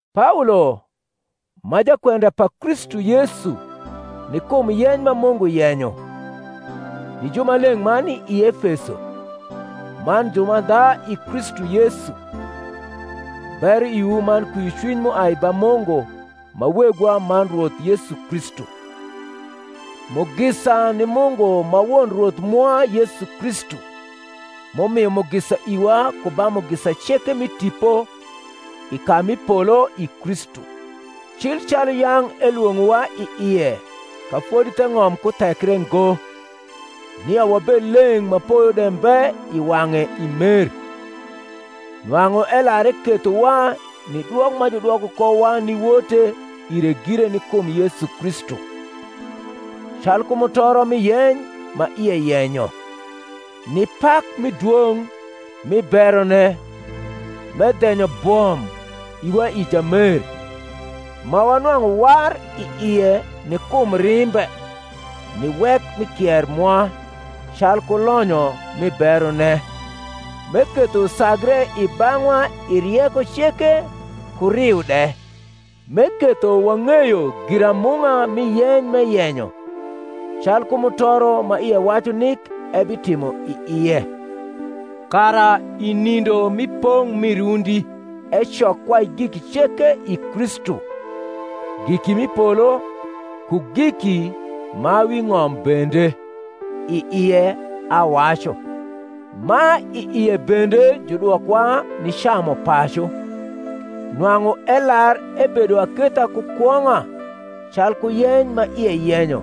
Paolo, ma jakwenda pa Kristu Yesu ni kum yeny ma Mungu yenyo, ni jumaleng’ ma ni i Efeso, man jumandha i Kristu Yesu: Bero iwu man kwiocwiny m’uai ba Mungu ma Wegwa man Rwoth Yesu Kristu. Mugisa ni Mungu ma Won Rwoth mwa Yesu Kristu, m’umio mugisa iwa ku ba mugisa ceke mi tipo i ka mi polo i Kristu: cil calu yang’ elwong’owa i ie ka fodi theng’om kuthekre ngo, nia wabed leng’ ma poyo de mbe i wang’e i mer: nwang’u elar ekethowa ni dwok ma judwoko kowa ni wote ire gire ni kum Yesu Kristu, calku mutoro mi yeny ma ie yenyo, ni pak mi dwong’ mi berone, m’edhenyo bwom iwa i Jamer; ma wanwang’u war i ie ni kum rimbe, ni wek mi kier mwa, calku lonyo mi berone, m’eketho usagre i bang’wa i rieko ceke ku riu de, m’eketho wang’eyo giramung’a mi yeny m’eyenyo, calku mutoro ma ie wacu nik ebitimo i ie kara i nindo mi pong’ mi rundi, ecok kwai giki ceke i Kristu, giki m’i polo, ku giki ma wi ng’om bende; i ie, awacu, ma i ie bende judwokowa ni camupacu, nwang’u elar ebedo aketha ku kwong’a calku yeny ma ie yenyo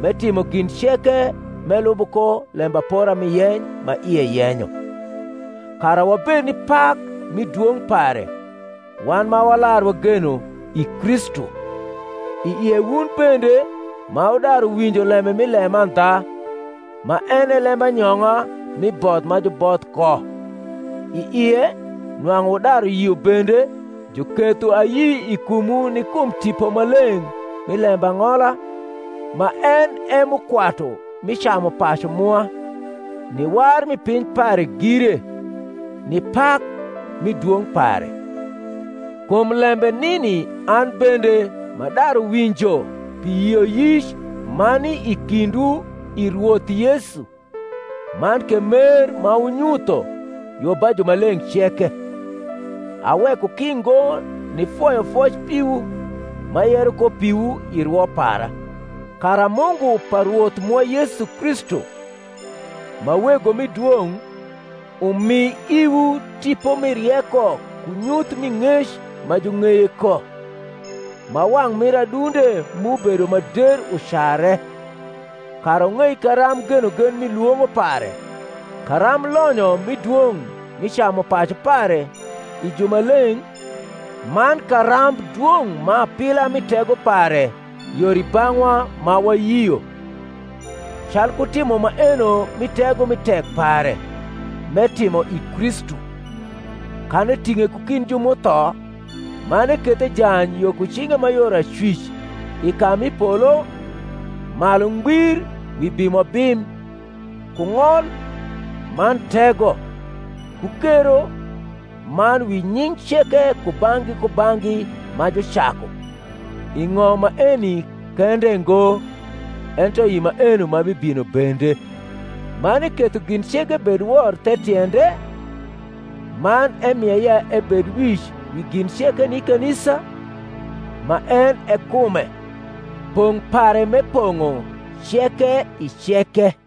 m’etimo gin ceke m’elubo ko lembapora mi yeny ma ie yenyo; kara wabed ni pak mi dwong’ pare, wan ma walar wageno i Kristu; i ie wun bende, ma wudaru winjo lembe mi lemandha, ma en e lembanyong’a mi both ma juboth ko, i ie, nwang’u wudaru yio bende, juketho ayi i kumwu ni kum Tipo Maleng’ mi lembang’ola, ma en e mukwatu mi camupacu mwa, ni war mi piny pare gire, ni pak mi dwong’ pare. Kum lembe nini an bende, m’adaru winjo pi yioyic ma ni i kindwu i Rwoth Yesu, man ke mer ma wunyutho yo ba jumaleng’ ceke, aweko ki ngo nifoyo foc piwu, m’ayero ko piwu i rwo para; kara Mungu pa Rwoth mwa Yesu Kristu, ma Wego mi dwong’, umi iwu tipo mi rieko ku nyuth mi ng’ec ma jung’eye ko; ma wang’ mir adunde mu bedo ma der ucare, kara wung’ei karamb genogen mi lwong’o pare, karamb lonyo mi dwong’ mi camupacu pare i jumaleng’, man karamb dwong’ ma apila mi tego pare yor i bang’wa ma wayio, calku timo maeno mi tego mi tek pare m’etimo i Kristu, kan eting’e ku kind ju m’utho, man eketho ejany yo ku cinge ma yor acwic i ka mi polo, malu ngbir wi bimobim, ku ng’ol, man tego, ku kero, man wi nying’ ceke kubang’gi kubang’gi ma jucaku, i ng’om maeni kende ngo, ento i maeno ma bibino bende; man eketho gin ceke bed wor the tiende, man emie ya ebed wic wi gin ceke ni kanisa, ma en e kume, pong’ pare m’epong’o ceke i ceke.